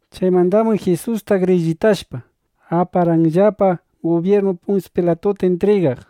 Chaymandaqam Jisusta grillitashpa, aparqanllapa gubyirnu Punsyu Pilatuta intrigaq.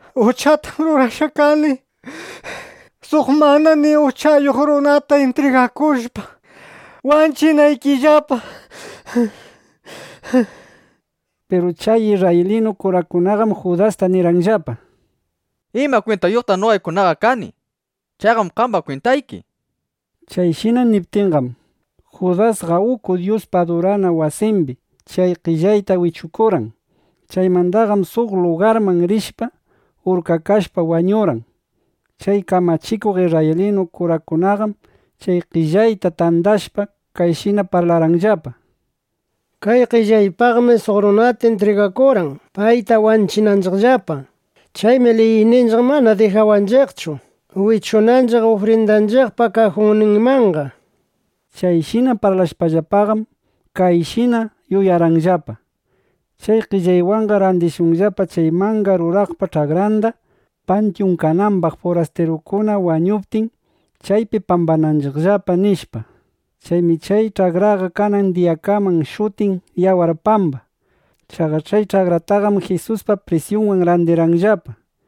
—Uchatam rurashqa kani, suq mana nima uchayuq runata intrigakushpa wanchinaykillapa, nishpa. Piru chay isrraylinu kurakunaqam Judastaqa nirqanllapa: —¿Ima kwintayuqtaq noqaykunaqa kani? Chayqam qamba kwintayki, nishpa. Chayshina niptinqam, Judasqa uku Dyuspa adurana wasimbi chay qellayta wichukurqan. Chaymandaqam suq lugarman rishpa, urkakashpa wañurqan. Chay kamachikuq isrraylinu kurakunaqam chay qellayta tandashpa, kayshina parlarqanllapa: —Kay qellaypaqmi suq runata intrigakurqan, payta wanchinanchiqllapa. Chaymi liyninchiq mana dijawanchiqchu wichunanchiq ufrindanchiqpa kajunninmanqa, nishpa. Chayshina parlashpallapaqam, kayshina yuyarqanllapa: Chay qellaywanqa randishunllapa chay manga ruraqpa ch'akranda, pantyun kanambaq, furastirukuna wañuptin, chaypi pambananchiqllapa, nishpa. Chaymi chay ch'akraqa kanan diyakaman shutin “Yawar Pamba”. Chaqa chay ch'akrataqam Jisuspa prisyunwan randirqanllapa.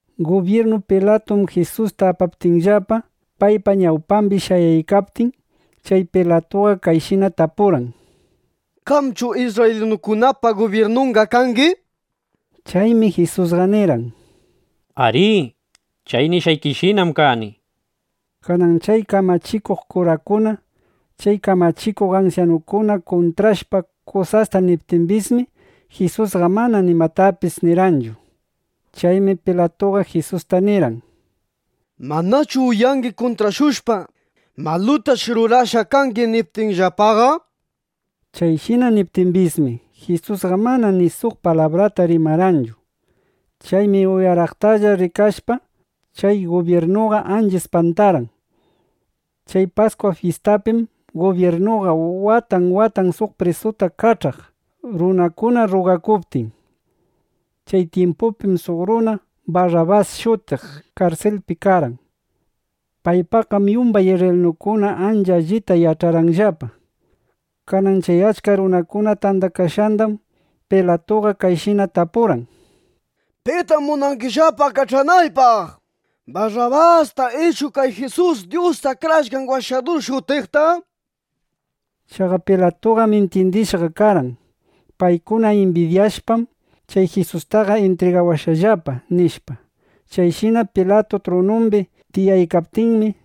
Gubyirnu Pilatuman Jisusta apaptinllapa, paypa ñawpambi shayaykaptinmi, chay Pilatuqa kayshina tapurqan: —¿Qamchu isrraylinukunapa gubyirnunqa kangi? nishpa. Chaymi Jisusqa nirqan: —Arí, chay nishqaykishinam kani, nishpa. Kanan chay kamachikuq kurakuna, chay kamachikuq ansyanukuna kuntrashpa kusasta niptimbismi, Jisusqa mana nimatapis nirqanchu. Chaymi Pilatuqa Jisusta nirqan: —¿Manachu uyangi kuntrashushpa, malutash rurashqa kangi, niptinllapaqa? Chayshina niptimbismi, Jisusqa mana ni suq palabrata rimarqanchu. Chaymi uyaraqtalla rikashpaqa, chay gubyirnuqa ancha ispantarqan. Chay Paskwa fyistapim gubyirnuqa watan watan suq prisuta kach'aq, runakuna rrugakuptin. Chay tyimpupim suq runa Barrabas shutiq karsilpi karqan. Paypaqqam yumbay isrraylinukuna ancha allita yach'arqanllapa. Kanan chay achka runakuna tandakashqandam Pilatuqa kayshina tapurqan: —¿Pitam munangillapa kach'anaypaq? ¿Barrabasta ichu kay Jisus Dyus Akrashqan Washadur shutiqta? nishpa. Chaqa Pilatuqam intyindishqa karqan: Paykuna imbidyashpam, kay Jisustaqa intrigawashqallapa, nishpa. Chayshina Pilatu trunumbi tiyaykaptinmi,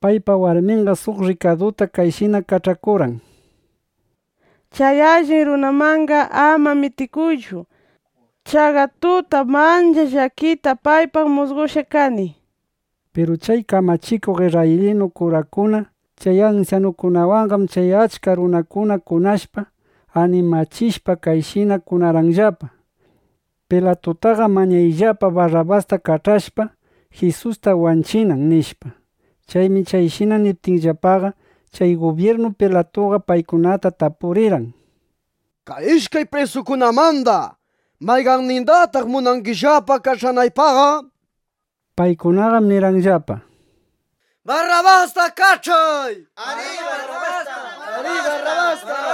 paypa warminqa suq rrikaduta kayshina kach'akurqan: —Chay allin runamanqa ama mitikuychu. Chaqa tutam ancha llakita paypaq musqoshqa kani, nishpa. Piru chay kamachikuq isrraylinu kurakuna, chay ansyanukunawanqam chay achka runata kunashpa, animachishpa, kayshina kunarqanllapa: —Pilatutaqa mañayllapa Barrabasta kach'ashpa, Jisusta wanchinan, nishpa. Chaymi chayshina niptinllapaqa, chay gubyirnu Pilatuqa paykunata tapurirqan: —Kay ishkay prisukunamanda, ¿mayqannindataq munangillapa kach'anaypaqqa? nishpa. Paykunaqam nirqanllapa: —¡Barrabasta kach'ay! nishpa.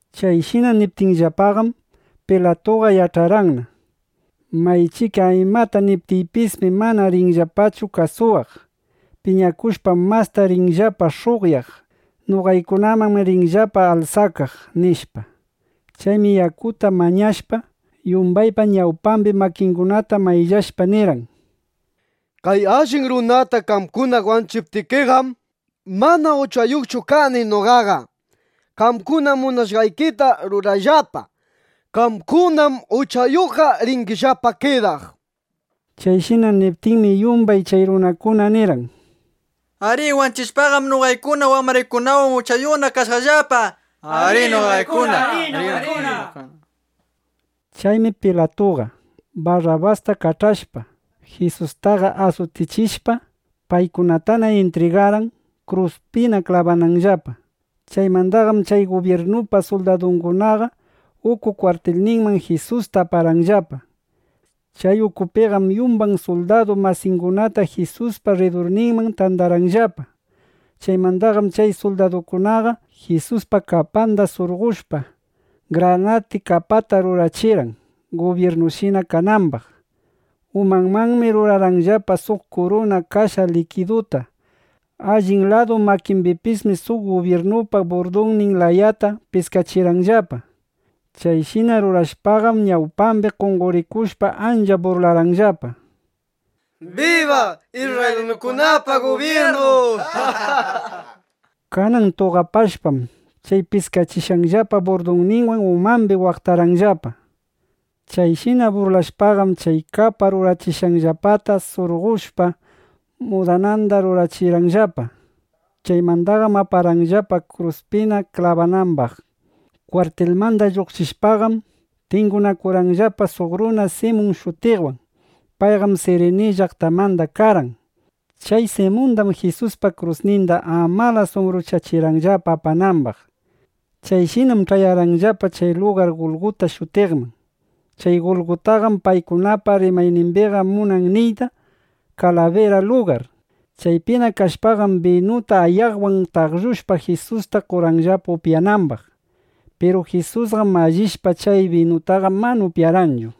Chayshina niptinllapaqam, Pilatuqa yach'arqanna: Maychika imata niptiypismi, mana rinllapachu kasuwaq. Piñakushpam mastana rinllapa sh'uqyaq. Noqamannam rinllapa alsakaq, nishpa. Chaymi yakuta mañashpa, yumbaypa ñawpambi makingunata mayllashpa, nirqan: —Kay allin runata qamkuna wanchiptikiqam, mana uchayuqchu kani noqaqa. Qamkuna munashqaykita rurayllapa. Qamkunam uchayuqqa ringillapa kidaq, nishpa. Chayshina niptinmi, yumbay chay runakunaqa nirqan: —¡Ari! Wanchishpaqam, noqaykuna wambraykunawan uchayuqkuna kashaqllapa, nishpa. Chaymi Pilatuqa, Barrabastana kach'ashpa, Jisustaqa asutichishpa, paykunatana intrigarqan, kruspina klabanambaqllapa. Chaymandaqam chay gubyirnupa suldadungunaqa uku kwartilninman Jisusta aparqanllapa. Chay ukupiqam yumbay suldadu masingunata Jisuspa rridurninman tandarqanllapa. Chaymandaqam chay suldadukunaqa Jisuspa kapanda surqoshpa, granati kapata rurachirqan, gubyirnushina kanambaq. Umanmanmi rurarqanllapa suq kuruna kasha likiduta. Allin ladu makimbipismi suq gubyirnupa burdunnin layata piskachirqanllapa. Chayshina rurashpaqam, ñawpambina qonqorikushpa, ancha burlarqanllapa: —¡Biba isrraylinukunapa gubyirnun! nishpa. Kanan tuqapashpam, chay piskachishqanllapa burdunwan umambi waqtarqanllapa. Chayshina burlashpaqam, chay kapa rurachishqanllapata surqoshpa, mudananda rurachirqanllapa. Chaymandaqam aparqanllapa, kruspina klabanambaq. Kwartilmanda lluqshishpaqam, tingunakurqanllapa suq runa Simun shutiqwan. Payqam Sirini llaqtamanda karqan. Chay Simundam Jisuspa krusninda amalas umbruchachirqanllapa apanambaq. Chayshinam ch'ayarqanllapa chay lugar Gulguta shutiqman. Chay Gulgutaqam paykunapa rimaynimbiqa munan niyta “Kalabira Lugar”, nishpa. Chaypina kashpaqam, binuta ayaqwan taqllushpa, Jisusta qorqanllapa upyanambaq. Piru Jisusqam mallishpa chay binutaqa, mana upyarqanchu.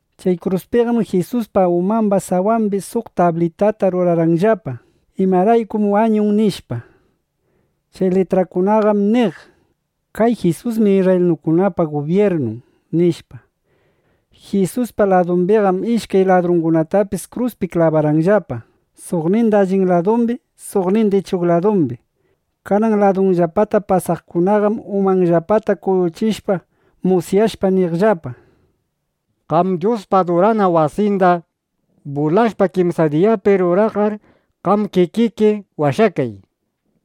Chay kruspiqam Jisuspa umamba sawambi suq tablitata rurarqanllapa, imaraykum wañun, nishpa. Chay litrakunaqam niq: “Kay Jisusmi isrraylinukunapa gubyirnun”, nishpa. Jisuspa ladumbiqam ishkay ladrungunatapis kruskunapi klabarqanllapa, suqninda allin ladumbi, suqninda ichuq ladumbi. Kanan ladunllapata pasaqkunaqam umanllapata kuyuchishpa, musyashpa niqllapa: —Qam Dyuspa adurana wasinda bulashpa kimsa diyapi ruraqqar, qam kikiki washakay.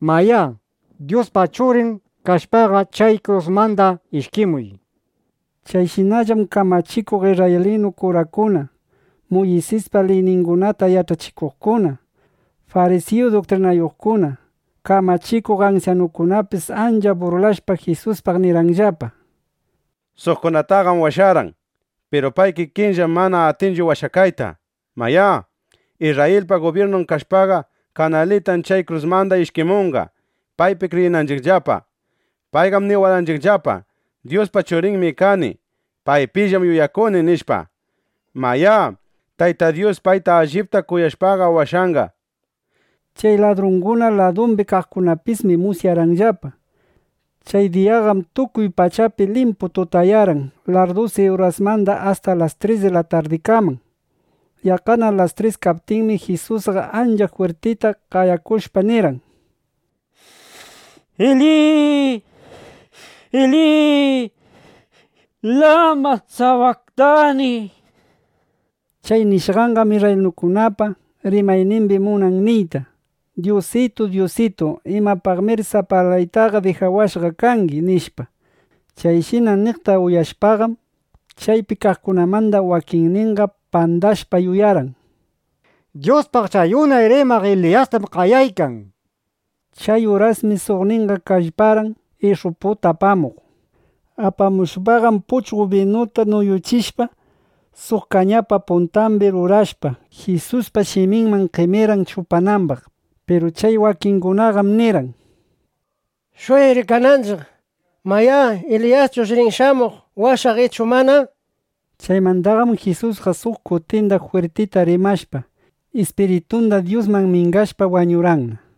Mayá, Dyuspa Churin kashpaqa, chay krusmanda ishkimuy, nishpa. Chayshinallam kamachikuq isrraylinu kurakuna, Muysispa liyningunata yach'achikuqkuna, farisiyu duktrinayuqkuna, kamachikuq ansyanukunapis ancha burlashpa, Jisuspaq nirqanllapa: —Suqkunataqam washarqan. Piru pay kikinllaqam mana atinchu washakayta. Mayá, Isrrayilpa gubyirnun kashpaqa, kanalitan chay krusmanda ishkimunqa, paypi kriyinanchiqllapa. Payqam niwarqanchiqllapa: “Dyuspa Churinmi kani. Paypillam yuyakuni”, nishpa. Mayá, Tayta Dyus payta allipta kuyashpaqa washanqa, nishpa. Chay ladrunguna ladumbi kaqkunapismi musyarqanllapa. Chay diyaqam tukuy pachapi limpu tutayarqan larrdusi urasmanda asta las tres di la tardikaman. Yaqqana las tris kaptinmi, Jisusqa ancha jwirtita qayakushpa, nirqan: —Eli, Eli, ¿lama sabaktani? nishpa. Chay nishqanqam isrraylinukunapa rimaynimbiqa munan niyta: “Dyusitu, Dyusitu, ¿imapaqmir sapalaytaqa dijawashqa kangi?” nishpa. Chayshina niqta uyashpaqam, chaypi kaqkunamanda wakinninqa pandashpa, yuyarqan: Dyuspaq chay unay rimaq Eliyastam qayaykan, nishpa. Chay urasmi suqnin kallparqan ish'uputa apamuq. Apamushpaqam puchqo binupi nuyuchishpa, suq kañapa puntambi rurashpa, Jisuspa shiminman qemirqan chupanambaq. Piru chay wakingunaqam nirqan: —Shuyay rikananchiq, mayá, ¿Eliyaschush rin shamuq washaq ichu mana? nishpa. Chaymandaqam Jisusqa suq kutinda jwirtita rimashpa, ispiritunda Dyusman mingashpa, wañurqanna.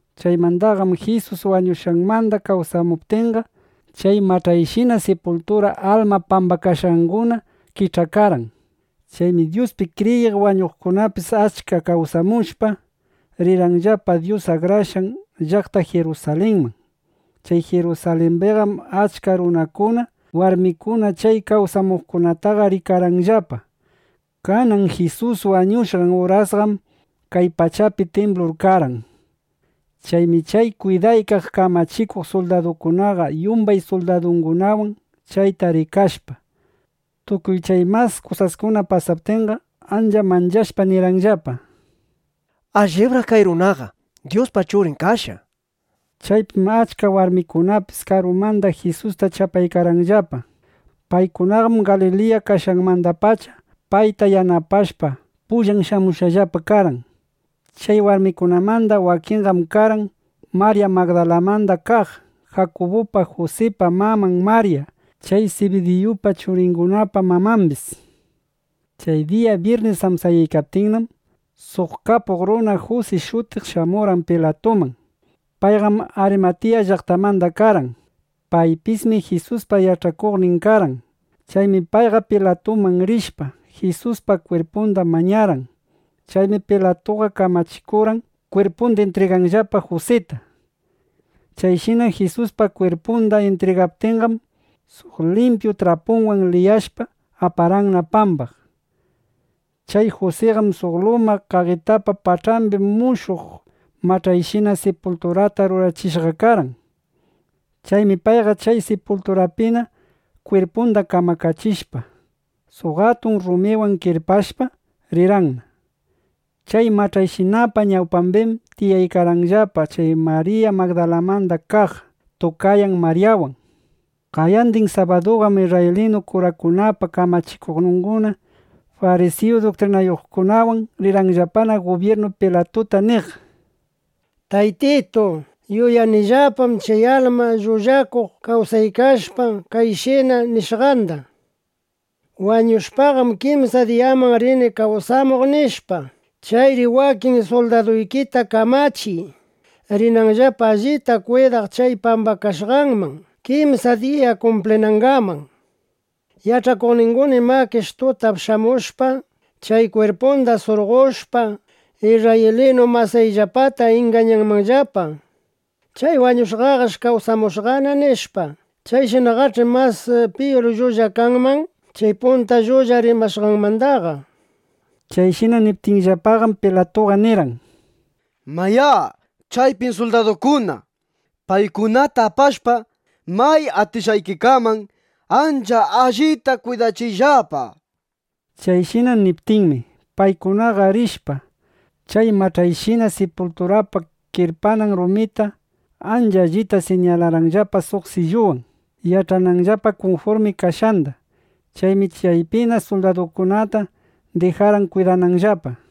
Chaymandaqam Jisus wañushqanmanda kawsamuptinqa, chay mach'ayshina sipultura alma pambakashqanguna kich'akarqan. Chaymi Dyuspi kriyiq wañushqakunapis achka kawsamushpa, rirqanllapa Dyus akrashqan llaqta Jirusalinman. Chay Jirusalimbiqam achka runakuna, warmikuna chay kawsamuqkunataqa rikarqanllapa. Kanan Jisus wañushqan urasqam kay pachapi timblur karqan. Chaymi chay kwidaykaq kamachikuq suldaduqa yumbay suldadungunawan chayta rikashpa, tukuy chay mas kusaskuna pasaptinqa, ancha manchashpa nirqanllapa: —Allibraq kay runaqa Dyuspa Churin kashqa, nishpa. Chaypim achka warmikunapis karumanda Jisusta chapaykarqanllapa. Paykunaqam Galiliya kashqanmandapacha payta yanapashpa, pullan shamushqallapa karqan. Chay warmikunamanda wakinninqam karqan: Marya Magdalamanda kaq, Jakubupa Jusipa maman Marya, chay Sibidiyupa churingunapa mamambis. Chay diya byirnis amsayaykaptinnam, suq kapuq runa Jusi shutiq shamurqan Pilatuman. Payqam Arimatiya llaqtamanda karqan. Paypismi Jisuspa yach'akuqnin karqan. Chaymi payqa Pilatuman rishpa, Jisuspa kwirpunda mañarqan. Chaymi Pilatuqa kamachikurqan, kwirpunda intrigananllapa Jusita. Chayshina Jisuspa kwirpunda intrigaptinqam, suq limpyu trapuwan liyashpa, aparqanna pambaq. Chay Jusiqam suq luma qaqitapa pach'ambi mushuq mach'ayshina sipulturata rurachishqa karqan. Chaymi payqa chay sipulturapina kwirpunda kamakachishpa, suq atun rumiwan kirpashpa, rirqanna. Chay mach'ayshinapa ñawpambim tiyaykarqanllapa chay Marya Magdalamanda kaq, tukayan Maryawan. Qayandin sabaduqam isrraylinu kurakunapa kamachikuqninguna farisiyu duktrinayuqkunawan rirqanllapa gubyirnu Pilatuta niq: —Taytitu, yuyanillapam chay alma llullakuq kawsaykashpa kayshina nishqanda: “Wañushpaqam kimsa diyaman rini kawsamuq”, nishpa. Chayri wakin suldaduykita kamachiy, rinanllapa allita kwidaq chay pambakashqanman, kimsa diya kumplinangaman. Yach'akuqninguna imakish tutap shamushpa, chay kwirpunda surqoshpa, isrraylinu masiyllapata ingañanmanllapa: “Chay wañushqaqash kawsamushqana”, nishpa. Chayshinaqach'i mas piyur llulla kanman chay punta llulla rimashqanmandaqa, nishpa. Chayshina niptinllapaqam, Pilatuqa nirqan: —Mayá, chaypim suldadukuna. Paykunata apashpa, may atishqaykikaman ancha allita kwidachiyllapa, nishpa. Chayshina niptinmi, paykunaqa rishpa, chay mach'ayshina sipulturapa kirpanan rumita ancha allita siñalarqanllapa suq silluwan, yach'ananllapa kunfurmi kashqanda. Chaymi chaypina suldadungunata dijarqan kwidananllapa.